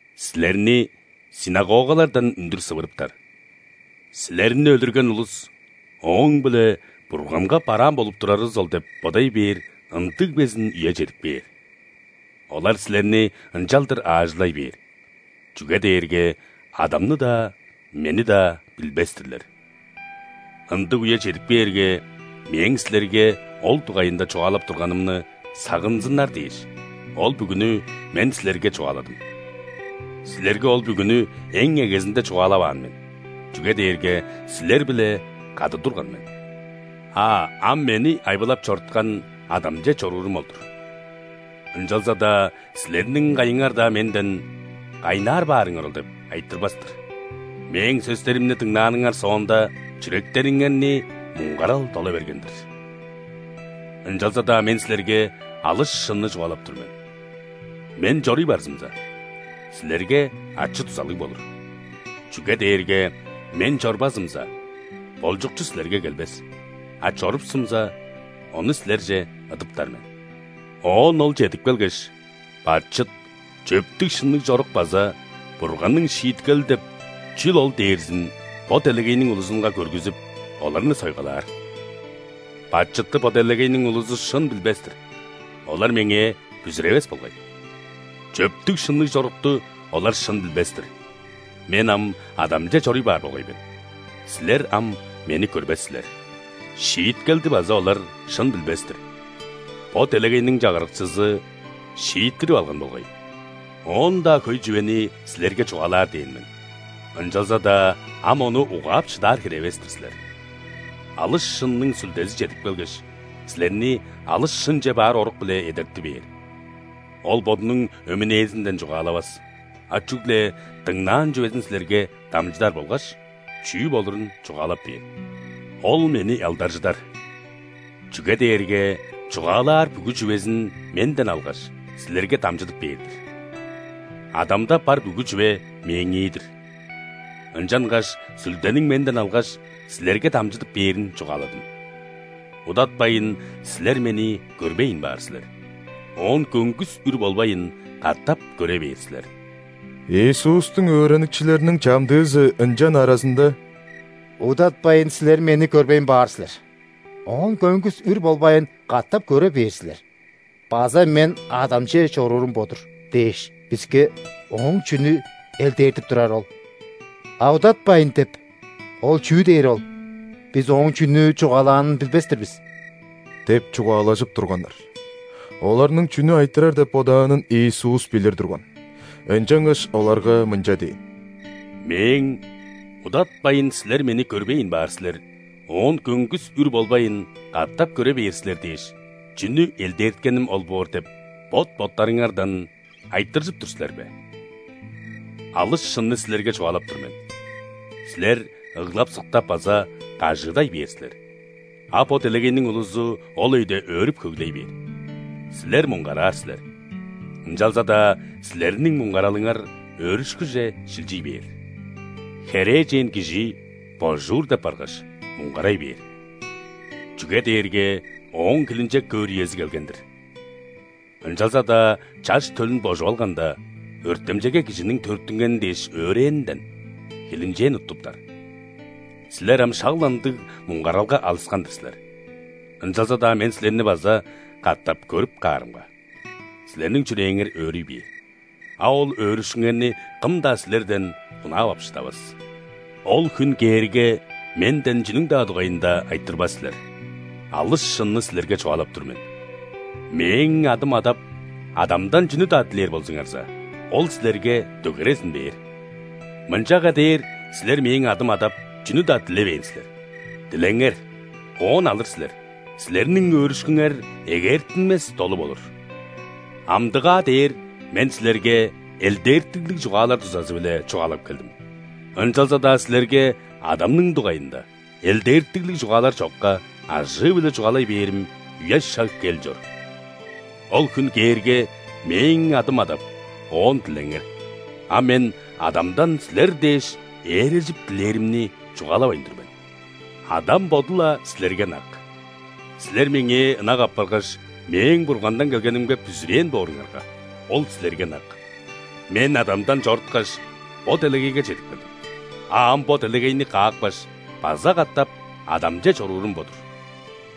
Силерни ·синагогалардан үндүр сывыртаптар. Силерни өлүрген улус ооң-биле Бурганга бараан болуп турарывыс ол деп бодай бээр ындыг безин үе чедип кээр. Олар силерни ынчалдыр аажылай бээр, чүге дээрге Адамны-даа, Мени-даа билбес-тирлер. Ындыг үе чедип кээрге, Мээң силерге ол дугайында чугаалап турганымны сагынзыннар дээш, ол бүгүнү Мен силерге чугааладым». «Силерге ол бүгүнү эң эгезинде чугаалаваан мен, чүге дээрге силер-биле кады турган мен. А ам Мени айбылап чоруткан Адамче чоруурум ол-дур. Ынчалза-даа силерниң кайыңар-даа Менден: „Кайнаар баарыңар ол?“ – деп айтырбас-тыр. Мээң сөстеримни дыңнааныңар соонда, чүректериңерни муңгарал дола берген-дир. Ынчалза-даа Мен силерге алыс шынны чугаалап тур мен: Мен чоруй барзымза, силерге ачы-дузалыг болур. Чүге дээрге Мен чорбазымза, Болчукчу силерге келбес, а чорупсумза, Ону силерже ыдыптар мен. Оон Ол чедип келгеш, бачыт, чөптүг-шынныг чорук база Бурганның шииткели деп чүл ол дээрзин бо делегейниң улузунга көргүзүп, оларны сойгалаар. Бачытты бо делегейниң улузу шын билбес-тир – олар Меңээ бүзүревес болгай. Чөптүг-шынныг чорукту олар шын билбес-тир – Мен ам Адамче чоруй баар болгай мен, силер ам Мени көрбес силер. Шииткелди база олар шын билбес-тир – бо делегейниң чагырыкчызы шииттирип алган болгай. Оон-даа хөй чүвени силерге чугаалаар дээн мен, ынчалза-даа ам ону угаап шыдаар хире эвес-тир силер. Алыс шынның Сүлдези чедип келгеш, силерни алыс шынче баар орук-биле эдерти бээр. Ол Бодунуң өмүнээзинден чугаалавас, а чүгле дыңнаан чүвезин силерге дамчыдар болгаш чүү болурун чугаалап бээр. Ол Мени алдаржыдар, чүге дээрге чугаалаар бүгү чүвезин Менден алгаш, силерге дамчыдып бээр-дир. Адамда бар бүгү чүве Мээңии-дир. Ынчангаш Сүлдениң Менден алгаш, силерге дамчыдып бээрин чугааладым. Удатпайн, силер Мени көрбейн баар силер, оон көңгүс үр болбайн, катап көре бээр силер». Иисустуң өөреникчилериниң чамдыызы ынчан аразында: «„Удатпайн, силер Мени көрбейн баар силер, оон көңгүс үр болбайн, катап көре бээр силер“ база „Мен Адамче чоруурум бо-дур“ – дээш, биске Ооң чүнү элдээртип турары ол? А: „Удатпайн“ – деп, ол чүү дээри ол? Бис Ооң чүнү чугаалаанын билбес-тир бис» – деп чугаалажып турганнар. Оларның чүнү айтырар деп бодаанын Иисус билир турган. Ынчангаш оларга мынча дээн: «Мээң: „Удатпайн, силер Мени көрбейн баар силер, оон көңгүс үр болбайн, катап көре бээр силер“ – дээш, чүнү элдээрткеним ол боор деп, бот-боттарыңардан айтыржып тур силер бе? Алыс шынны силерге чугаалап тур мен: силер ыглап-сыктап база кажыыдай бээр силер, а бо делегейниң улузу ол өйде өөрүп-хөглей бээр. Силер муңгараар силер, ынчалза-даа силерниң муңгаралыңар өөрүшкүже шилчий бээр. Херээжен кижи божуур деп баргаш, муңгарай бээр, чүге дээрге ооң хилинчек көөр үези келген-дир. Ынчалза-даа чаш төлүн божуп алганда, өртемчейге кижиниң төрүттүнгени дээш өөрээнинден, хилинчээн уттуптар. Силер ам шак-ла ындыг муңгаралга алыскан-дыр силер, ынчалза-даа Мен силерни база катап көрүп каарымга, силерниң чүрээңер өөрүй бээр, а ол өөрүшкүңерни кым-даа силерден хунаап ап шыдавас. Ол хүн кээрге, Менден чүнүң-даа дугайында айтырбас силер. Алыс шынны силерге чугаалап тур мен: Мээң адым адап, Адамдан чүнү-даа дилээр болзуңарза, Ол силерге дөгерезин бээр. Мынчага дээр силер Мээң адым адап, чүнү-даа дилевээн силер. Дилеңер, оон алыр силер, силерниң өөрүшкүңер эгээртинмес долу болур». «Амдыгаа дээр Мен силерге элдээртиглиг чугаалар дузазы-биле чугаалап келдим. Ынчалза-даа силерге Адамның дугайында, элдээртиглиг чугаалар чокка, ажыы-биле чугаалай бээрим үе-шаг кел чор. Ол хүн кээрге, Мээң адым адап, Оон дилеңер. А Мен Адамдан силер дээш ээрежип дилээримни чугаалавайн тур мен, Адам Боду-ла силерге ынак. Силер Меңээ ынак апаргаш, Мээң Бургандан келгенимге бүзүрээн бооруңарга, Ол силерге ынак. Мен Адамдан чоруткаш, бо делегейге чедип келдим, а ам бо делегейни каапкаш, база катап Адамче чоруурум бо-дур».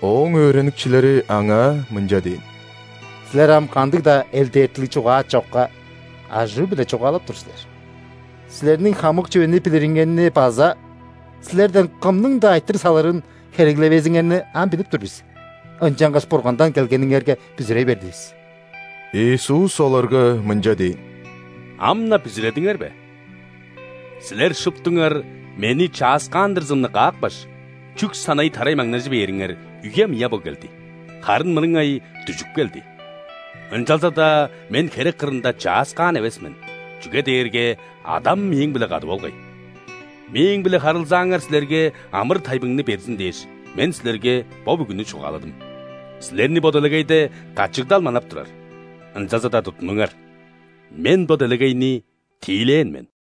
Ооң өөреникчилери Аңаа мынча дээн: «Силер ам кандыг-даа элдээртиглиг чугаа чокка, ажыы-биле чугаалап тур силер. Силерниң хамык чүвени билириңерни база Силерден кымның-даа айтырыг салырын хереглевезиңерни ам билип тур бис. Ынчангаш Бургандан келгениңерге бүзүрей бердивис». Иисус оларга мынча дээн: «Ам-на бүзүредиңер бе?! Силер шуптуңар Мени чааскаандырзымны каапкаш, чүк санай тарай маңнажы бээриңер үе мыя бо келди, харын мырыңай дүжүп келди. Ынчалза-даа Мен херек кырында чааскаан эвес мен, чүге дээрге Адам Мээң-биле кады болгай. Мээң-биле харылзааңар силерге амыр-тайбыңны берзин дээш, Мен силерге бо бүгүнү чугааладым. Силерни бо делегейде качыгдал манап турар, ынчалза-даа туттунуңар: Мен бо делегейни тиилээн мен!»